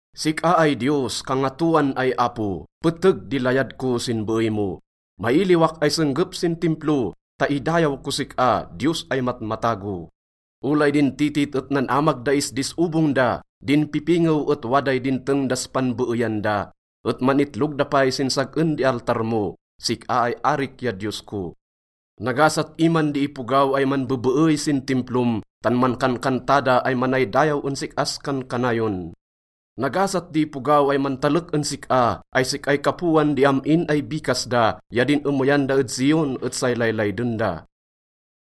Sik-a ay Diyos, Kangatoan ay Apo, peteg di layad ko sin beey mo. Mailiwak ay senggep sin Timplo ta idayaw kos sik-a, Diyos ay matmatago. Olay din titit et nan-amag da isdis obong da, din pipingew et waday dinteng das panbeeyan da, et man-itlog da pay sin sag-en di altar mo, sik-a ay arik ya Diyos ko. Nagasat iman di ipogaw ay manbebeey sin Timplom tan mankankanta da ay manaydayaw en sik-as kankanayon. Nagasat di ipogaw ay mantalek en sik-a ay sik-ay kapoan di am-in ay bikas da ya din emeyan da ed Zion et say laylayden da.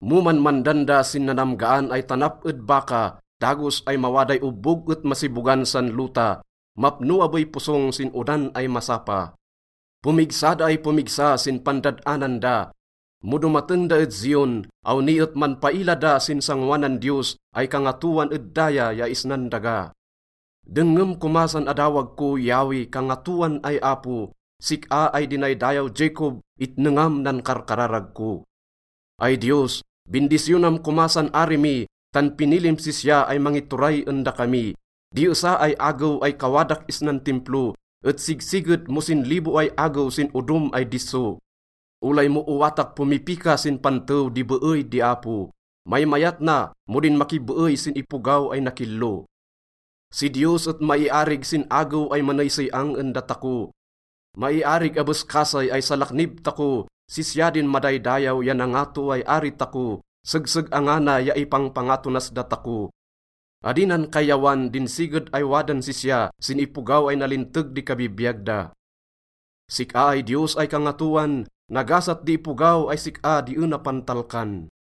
Mo manmandan da sin nanamgaan ay tanap ed Baca, dagos ay mawaday obbog et masibogan san lota. Mapno abey posong sin odan ay masapa. Pomigsa da ay pomigsa sin pandad-anan da. Mo domateng da ed Zion, awni et manpaila da sin sangoanan Diyos ay kangatoan ed daya ya isnan daga. Dengngem koma san adawag ko, Yahweh, Kangatoan ay Apo, sik-a ay dinaydayaw Jacob, itnengam nan karkararag ko. Ay Diyos, bindisyonam koma san ari mi tan pinilim sisya ay mangituray en dakami. Di esa ay agew ay kawadak isnan Timplo et sigsiged mo sinlibo ay agew sin odom ay disso. Olay mo owatak pomipika sin pantew di beey di Apo, maymayat na mo din makibeey sin ipogaw ay nakillo. Si Diyos et maiarig sin agew ay maneysey-ang en datako. Maiarig abes kasay ay salaknib tako. Sisya din madaydayaw ya nangato ay ari tako. Segseg-angana ya ipangpangato nas datako. Adi nan kayyawan din siged ay wadan sisya sin ipogaw ay nalinteg di kabibiyag da. Sik-a ay Diyos ay Kangatoan, nagasat di ipogaw ay sik-a di ena pantalkan.